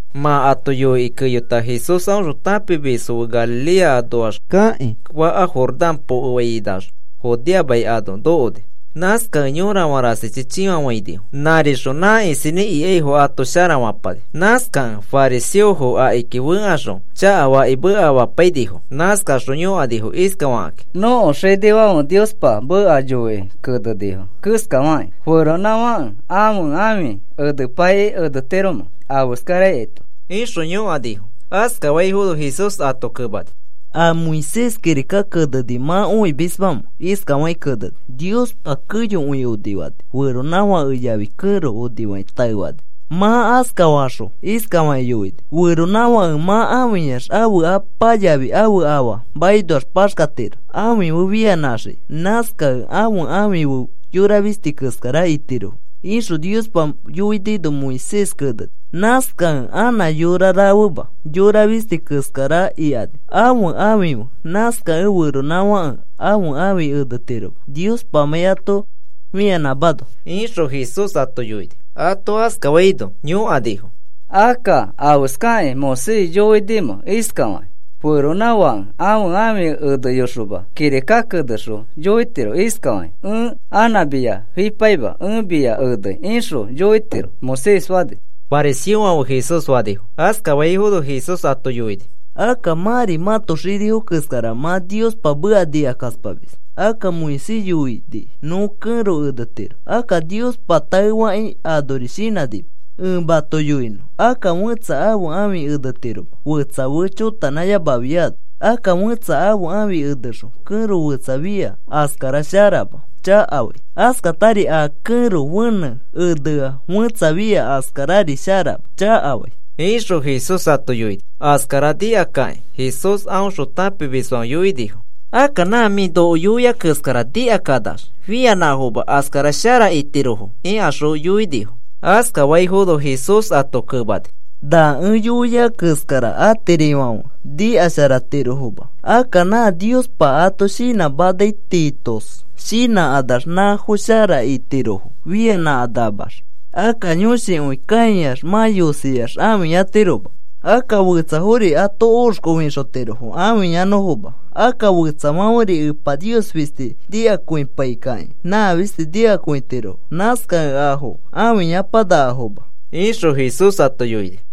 Mã ato yoikĩ keyota Jesús aõxõ tãpimisfo fe Galilea anoax kakĩ faka Jordán pokefainax Judea mai ano nokoni. Nãskakẽ yorafã rasichi chĩfafãinifo. Nãrixõ nã isinĩ ikaifo ato sharafapani. Nãskakẽ fariseofo akiki fẽkaxõ chakafakĩ mekamapainifo. Nãskaxõ yõkanifo iskafakĩ: “Nõko xinifãfe Niospa meka yoikĩ kenenifo keskafakĩ, ¿feronãfãke ãfe ãfi enepaikĩ enetiromẽ afeskaraito?” ixõ yõkanifo. Askafaifono Jesús ato kemani: “¿A Moisés kirika keneni mã õimismamẽ? Iskafakĩ keneni: ‘Niospa keyokõi onifani. Feronãfake yafi kẽro onifakĩ taefani. Mã askafaxõ iskafakĩ yoini: “Feronãfake mã ãfiyax ãfe apa yafi ãfe afa makinoax paxkatiro ãfi fe fianãxiki. Nãskakẽ ãfe ãfi fe yora fisti keskara itirofo,” ’ ixõ Niospa yoinino Moisés keneni. Nãskakẽ anã yora rafema, yora fisti keskara ikani ãfe ãfi fe. Nãskakẽ feronãfãke ãfe ãfi enetiroma Niospamãi ato fianãmano,” ixõ Jesús ato yoini. Ato askafaino yõkanifo: “Akka, ¿afeskakĩ Moisés yoinimẽ iskafakĩ? ‘Feronãfãke ãfe ãfi eneyoxoma kirika kenexõ yoitiro iskafakĩ: “Ẽ anã mia fipaima. Ẽ mia enei,” ’ ixõ yoitiro Moisés fani,” fariseofãfe Jesús fanifo. Askafaifono Jesús ato yoini: “Akka mãri mãto xinifo keskara mã Niospa meka nikakaspamis. Akka Moisés yoini nõ kẽro enetiro. Akka Niospa taefakĩ anori shinãnima. Ẽ mato yoinõ. Akka fẽtsa ãfe ãfi enetiroma fetsa fe chotanãyamafiano. Akka fẽtsa ãfe ãfi enexõ kẽro fetsa fia askara sharama, chakafai. Askatari a kẽro fenẽ enea fẽtsa fia askarari sharama, chakafai,” ixõ Jesús ato yoini. Askara nikakakĩ Jesús a aõxõ tãpimisfãfe yoinifo: “Akka nã mĩ noko yoiai keskara nikakanax, fianãfoma askara shara itirofo,” ikaxõ yoinifo. Askafaifono Jesús ato kemani: “Na ẽ yoiai keskara atirifãfe nikasharatirofoma. Akka nã Niospa ato shinãmanai tiitos shinãkanax nãfo shara itirofo fianãkanamax. Akka yõshikõi kãiax mã yosiax ãfiyatiroma. Akka fetsafori ato oxkofĩxotirofo ãfiyanõfoma. Akka fetsafãferi Epa Nios fisti nikakõipaikakĩ, nã fisti nikakõitirofo. Nãskakẽ afo ãfiyapakenakafoma,” ixõ Jesús ato yoini.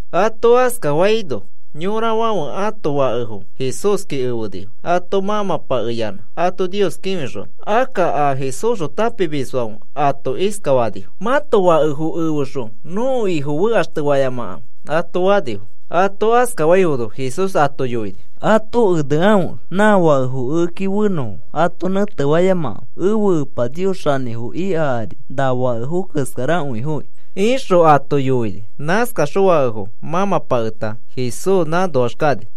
Ato askafaino yorafãfe ãto fakefo Jesúski efenifo ato mãmãpakeyanã ato Nios kĩfixonõ. Akka a Jesúsxõ tãpimisfãfe ato iskafanifo: “Mãto fakefo efexõ nõko Ifo fekaxtefayamakãfe,” ato fanifo. Ato askafaifono Jesús ato yoini: “Ato enekãfe nã fakefo ekeki fenõfo. Ato nẽtefayamakãfe. Ẽfe Epa Nios xanĩfo ika ari na fakefo keskarakõifoki,” ixõ ato yoini. Nãskaxõ fakefo mãmãpaketa Jesús nãnoax kani.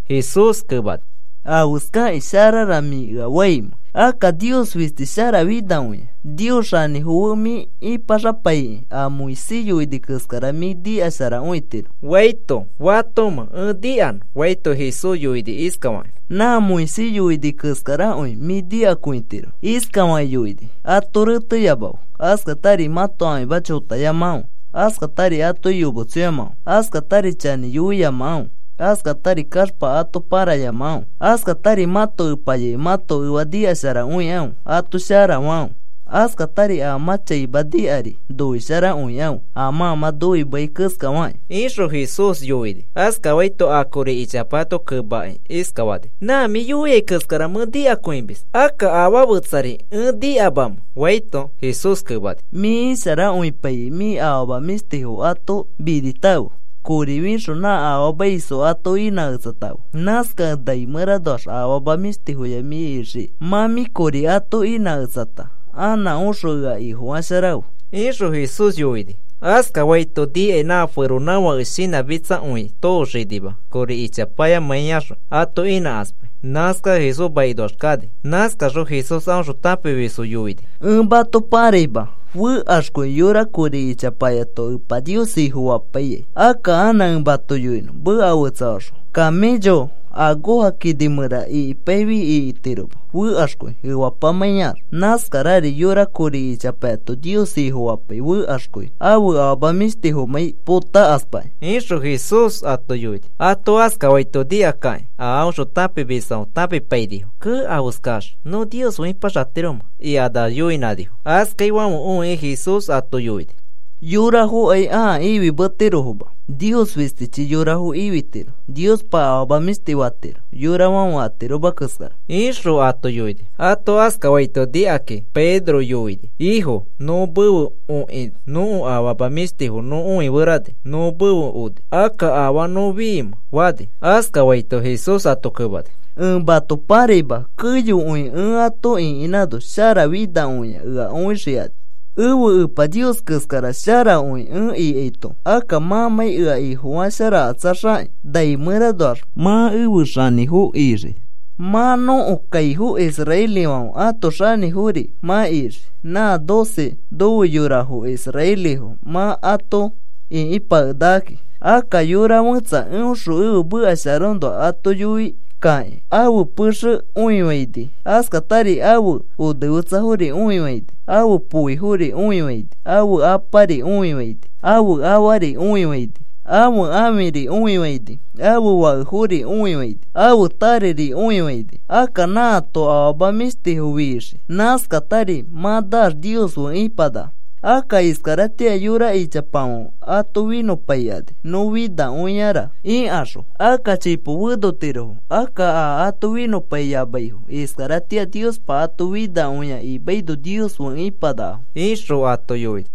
Jesús kemani: “¿Afeskakĩ sharara mĩ ea faimẽ? Akka Nios fisti sharafinakõia. Nios xanĩfo fe mĩ ipaxapaikĩ a Moisés yoini keskara mĩ nikasharakõitiro,” faito, “¿Fatomẽ ẽ nikanõ?” faito, Jesús yoini iskafakĩ: “Nã Moisés yoini keskarakõi mĩ nikakõitiro. Iskafakĩ yoini: ‘Ato reteyamakãfe. Askatari mãto ãfima chotayamakãfe. Askatari atoki yometsoyamakãfe. Askatari chanĩ yoiyamakãfe. Askatari kaxpa ato parayamakãfe. Askatari mãto epa yafi mãto efa nikasharakõikãfe, ato sharafakãfe. Askatari a mã chaima nikari noisharakõikãfe a mã mã noimeai keskafakĩ,’” ixõ Jesús yoini. Askafaito a kori ichapayato kemakĩ iskafani: “Nã mĩa yoiai keskara mẽ nikakõimis. Akka, ¿afaa fetsari ẽ nikamamẽ?” faito, Jesús kemani: “Mĩ isharakõipaikĩ, mĩ afama mĩshtifo ato minitãfe. Kori fixõ nã afaamaisfo ato inãketsatãfe. Nãskakẽ nai mẽranoax afama mĩshtifoya mĩ ixikai. Mã mĩ kori ato inãketsata anã oxõ ea Ifofasharafe,” ixõ Jesús yoini. Askafaito nikai nã feronãfãke shinãchakakõi tooxinima kori ichapayamãiyaxõ ato inãkaspai. Nãskax Jesús makinoax kani. Nãskaxõ Jesús aõxõ tãpimisfo yoini: “Ẽ mato pãraima, fekaxkõi yora kori ichapayato Epa Nios Ifofapaia. Akka anã ẽ mato yoinõ meka fetsafaxõ. Camello akoja kini mẽra ikipaifi ikitiroma, fekaxkõi, efapamãiax. Nãskarari yora kori ichapayato Nios Ifofapai, fekaxkõi ãfe afama mĩshtifomãi potakaspakĩ,” ixõ Jesús ato yoini. Ato askafaito nikakakĩ a aõxõ tãpimisfãfe tãpipainifo. “¡Kee! ¿Afeskax nõ Nios fe ipaxatiromẽ?” ikanax yoinãnifo. Askaifãfe õikĩ Jesús ato yoini: “Yorafokai ãa ifimetirofoma. Nios fistichi yorafo ifitiro. Niospa afama mĩshtifo fatiro, yorafãfe atiroma keskara,” ixõ ato yoini. Ato askafaito nikakĩ Pedro yoini: “Ifo, nõ mefe okĩ nõko afama mĩshtifo nõ õiferani nõ mefe oni. Akka, ¿afaa nõ fiimẽ?” fani. Askafaito Jesús ato kemani: “Ẽ mato pãraima. Keyokõi ẽ ato ĩkinãno sharafinakõia ea õixikani, ẽfe Epa Nios keskara sharakõi ẽ ikaito. Akka mãmãi ea Ifofasharakatsaxakĩ nai mẽranoax mã efe xanĩfofo ixii. Mã nõko kaifo israelifãfe ãto xanĩfori mã ixii. Nã doce nofe yorafo israelifo mã ato ĩkipakenakakĩ. Akka yora fẽtsa eõxõ ẽfe meka sharaõnoa ato yoikakĩ ãfe pexe õifaini, askatari ãfe onefetsafori õifaini, ãfe poifori õifaini, ãfe apari õifaini, ãfe afari õifaini, ãfe ãfiri õifaini, ãfe fakefori õifaini, ãfe tareri õifaini, akka nãato afama mĩshtifo fixii. Nãskatari mã naax Nios fe ipanaka. Akka iskaratĩa yora ichapafãfe ato finõpaikani, nõ finakõiara ikaxõ, akka chipo fenotirofo. Akka a ato finõpaiyamaifo iskaratĩa Niospa ato finakõia imaino Nios fe ipanakafo,” ixõ ato yoini.